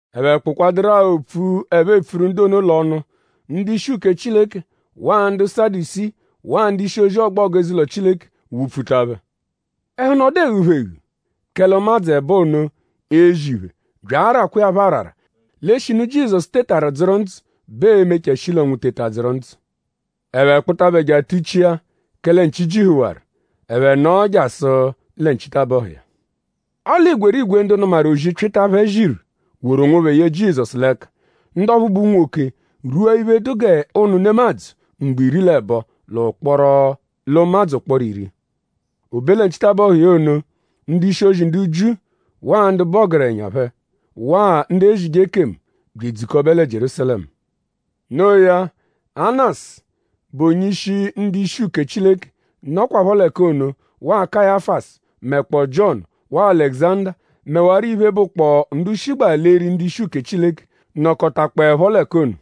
Ẹphe kpụkwaduru-a opfu, ẹphe epfuru ndu ono l'ọnu; ndu-ishi uke Chileke waa ndu Sadusii waa onye-ishi ọgbogu eze-ụlo Chileke wụ-pfuta phẹ. Ẹhu nọdu eghu phẹ eghu; kẹle ụmadzu ẹbo ono ezi iphe bya arakwa iya phọ arara l'eshinu Jizọsu tetaru dzụru ndzụ bẹ ee-mechaa shi l'ọnwu teta dzụru ndzụ. Ẹphe kpụta phẹ je atuchia kẹle nchi jihuwaru. Ẹphe nọo jasụ lẹ nchitabọhu iya. Ọle igwerigwe ndu nụmaru ozi, Pyịta phẹ ziru woru onwophẹ ye Jizọsu l'ẹka. Ndu ọphu bụ unwoke rwua iphe, dụ g'ụnu nemadzụ mgbo iri l'ẹbo l'ụmadzu ụkporo iri. O be lẹ nchitabọhu iya ono; ndu-ishi ndu Jiu waa ndu bụ ọgerenya phẹ waa ndu ezije ekemu bya edzukọbe lẹ Jierúsalẹmu. Noo ya; Anasu, bụ onye-ishi ndu-ishi uke Chileke nọkwapho l'ẹka ono waa Kayafasu mẹkpoo Jiọnu waa Alẹguzanda; mẹwaro iphe, bụkpoo ndu shigbaa l'eri ndu-ishi uke Chileke nọkotakpoepho l'ẹka ono.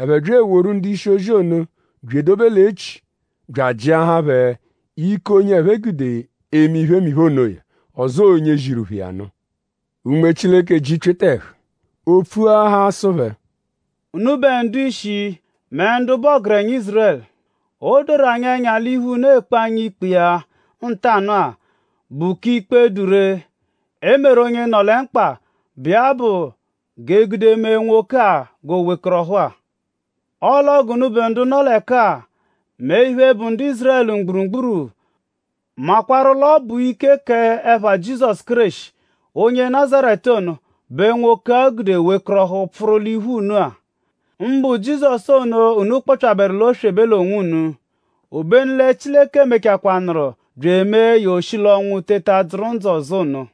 Ẹphe bya eworu ndu-ishi-ozi ono bya edobe l'echi bya ajịahaa phẹ ike onye ẹphe gude eme iphemiphe onoya; ọzoo onye ziru phẹ iya nụ. Unme Chileke ji Pyịta ẹhu; o pfuahaa sụ phẹ: “Unubẹ ndu-ishi mẹ ndu bụ ọgerenya Ízurẹlu. O doru anyi ẹnya l'iphe, unu ekpe anyi ikpe iya ntanụ-a bụ k'iphe, dụ ree, e meru onye nọ lẹ mkpa, bụ iya bụ g'e gude mee nwoke-a g'o wekọrohu-a. Ọle ọo g'unubẹ ndu nọ l'ẹka-a; mẹ iphe, bụ ndu Ízurẹlu mgburugburu makwarụ l'ọ bụ ike k'ẹpha Jizọsu Kéreshi onye Nazaretu ono; bẹ nwoke-a gude wekọrohu pfụru l'iphu unu-a. Mbụ Jizọsu ono, unu kpọpyaberu l'oswebe l'onwunu; obenu lẹ Chileke mechakwanaarụ bya emee ya o shi l'ọnwu teta dzụru ndzụ ọzo ono.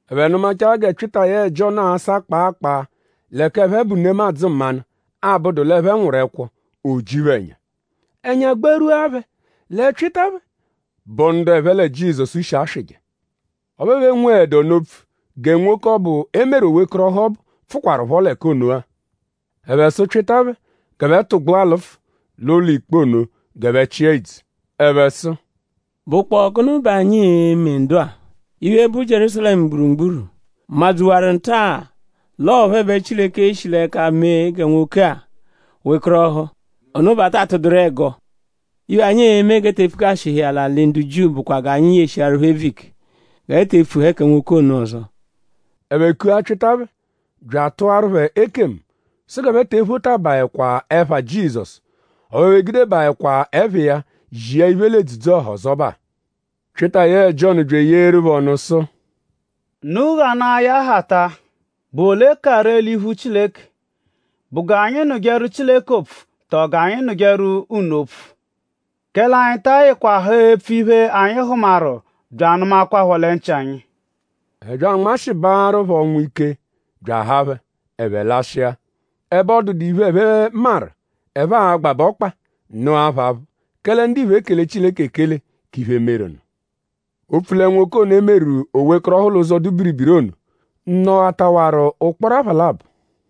Ẹphe nụmachaa gẹ Pyịta yẹe Jiọnu asa kpaa kpaa; l'ẹka ẹphe bụ nemadzụ mmanụ, abụdu l'ẹphe nwụru ẹkwo; o ji phẹ ẹnya. Ẹnya gbarwua phẹ lẹ Pyịta phẹ bụ ndu ẹphe lẹ Jizọsu shi aswịje. Ọphu ẹphe enweẹdu ọnu opfu gẹ nwoke ọbu, e meru o wekọrohu ọbu pfụkwarupho l'ẹka ono-a. Ẹphe sụ Pyịta phẹ g'ẹphe tụgbua lụfu l'ụlo-ikpe ono g'ẹphe chịa idzu. Ẹphe sụ: “?Bụkpoo gụnu bẹ anyi e-me ndu-a? Iphe, bụ Jierúsalẹmu mgburugburu madzuwaru nta-a l'ọo phẹ bẹ Chileke shi l'ẹka mee gẹ nwoke-a wekọrohu. Ono bẹ a ta atụduru ẹgo. Iphe, anyi e-me g'e te epfukashihẹ iya l'alị Jiu bụkwa g'anyi yeshịaru phẹ ebvu ike g'ẹphe te epfuẹhe kẹ nwoke ono ọzo.” Ẹphe kua Pyịta phẹ bya atụaru phẹ ekemu sụ g'ẹphe te ephotabaẹkwa ẹpha Jizọsu; ọphu ẹphe egudebaẹkwa ẹpha iya zia iphe l'edzudzu-ọha ọzobaa. Pyịta yẹe Jiọnu bya eyeeru phẹ ọnu sụ: “Unu ghanaa ya hata.?Bụ ole ka ree l'iphu Chileke??Bụ g'anyi nụjeru Chileke opfu tọo g'anyi nụjeru unu opfu? Kẹle anyi ta ayịkwa haa epfu iphe, anyi hụmaru bya anụmakwapho lẹ nchị anyi.” Ẹphe bya anmashịbaaru phẹ ọnwu ike bya ahaa phẹ; ẹphe lashịa. Ẹbe ọ dụdu iphe, ẹphe maru, ẹphe a-gbabẹ ọkpa nụa phẹ aphụ; kẹle ndiphe ekele Chileke ekele k'iphe, meru nụ; opfu lẹ nwoke ono, e meru o wekọrohu l'ụzo, dụ biribiri ono nọghataawaru ụkporo apha labọ.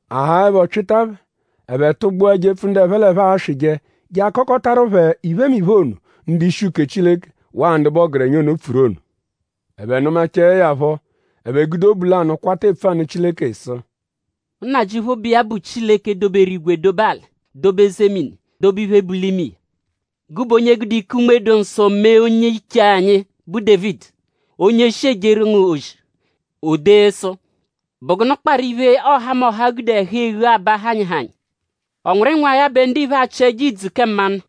A haaẹpho Pyịta phẹ; ẹphe tụgbua jepfu ndu ẹphe l'ẹphe aswịje je akọkotaru phẹ iphemiphe ono, ndu-ishi uke Chileke waa ndu bụ ọgerenya ono pfuru ono. Ẹphe nụmachae ya phọ; ẹphe gude obu lanụ kwata epfu anụ Chileke sụ: “Nnajịuphu, bụ iya bụ Chileke, doberu igwe dobe alị dobe eze mini dobe iphe, bu l'ime iya. Gụbe onye gude ike Unme-dụ-Nsọ mee onye-iche anyi, bụ Dévidi; onye shi ejeru ngu ozi; o dee sụ: “?Bụ gụnu kparụ iphe, ọhamoha gude ẹhu-eghu aba hanyịhanyi??Ọ nwụru ịnwagha bẹ ndiphe achị ẹjo idzu kẹ mmanụ?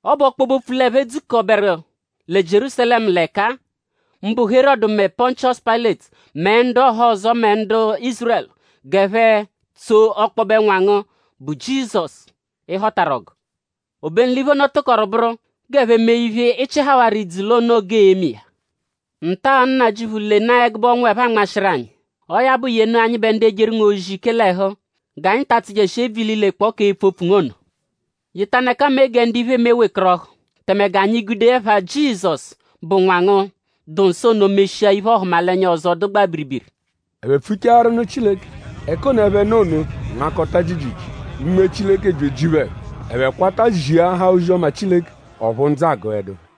Ọ bụ ọkpobe-opfu l'ẹphe dzukọru lẹ Jierúsalẹmu l'ẹka-a; mbụ Herọdu mẹ Pọnchiosu Payịleti; mẹ ndu ọhozo mẹ ndu Ízurẹlu; g'ẹphe tsoo ọkpobe Nwa ngu, bụ Jizọsu, ị họtaru ọgu. Obenu l'iphe ono tụkoru bụru g'ẹphe mee iphe, ị chịhawaru l'ìdzù l'o noo g'ee-me iya. Nta-a Nnajịuphu; lenaa ẹgube ọnwu, ẹphe anmashịru anyi. Ọo ya bụ; yenu anyịbe ndu ejeru ngu ozi ike l'ẹhu; g'anyi ta atsụjeshi ebvu ililekpọo k'epfu opfu ngu ono. Yetanụ ẹka mee gẹ ndu iphe eme wekọrohu; tẹme g'anyi gude ẹpha Jizọsu, bụ Nwa ngu, dụ nsọ ono meshia iphe-ọhumalenya ọzo, dụgbaa biribiri.” Ẹphe pfuchaaru nụ Chileke; ẹka ono, ẹphe nọ ono nmakọta jiijiijii. Unme Chileke bya eji phẹ ẹhu; ẹphe kwata ziahaa ozi-ọma Chileke; ọphu ndzụ agụedu phẹ.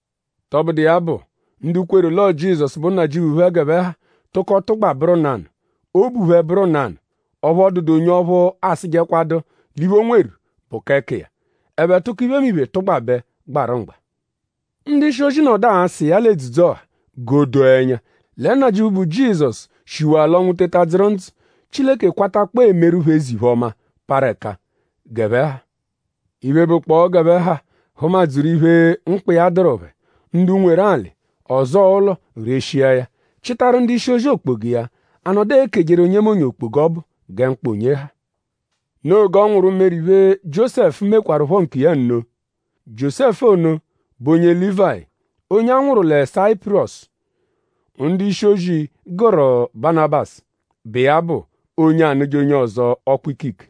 Tọbudu iya bụ; ndu kweru l'ọo Jizọsu bụ Nnajịuphu phẹ g'ẹphe ha tụko tụgba bụru nanụ. Obu phẹ bụru nanụ. Ọphu ọ dụdu onye ọphu asụjekwadu l'iphe, o nweru bụ k'ẹka iya. Ẹphe tụko iphemiphe tụgbabe gbarụ mgba. Ndu-ishi-ozi nọdu asa iya l'edzudzu-ọha g'o doo ẹnya; lẹ Nnajịuphu, bụ Jizọsu shiwaa l'ọnwu teta dzụru ndzụ. Chileke kwatakpọo emeru phẹ eze-iphe-ọma, parụ ẹka g'ẹphe ha. Iphe, bụkpoo g'ẹphe ha hụma-dzuru iphe, mkpa iya dụru phẹ. Ndu nweru alị; ọzoo ụlo reshia ya chịtaru ndu-ishi-ozi okpoga iya. A nọdu ekejeru onyemonye okpoga ọbu gẹ mkpa onye ha. Noo g'ọ nwụru meru iphe, Jiósẹfu mekwarụpho nkiya nno. Jiósẹfu ono bụ onye Lívayi; onye a nwụru lẹ Sayipurọsu, ndu-ishi-ozi gụru Banabasu, bụ iya bụ “onye anụje onye ọzo ọkpu-ikike.”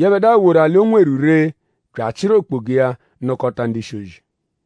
Yẹbedua woru alị, o nweru ree bya achịru okpoga iya nụkota ndu-ishi-ozi.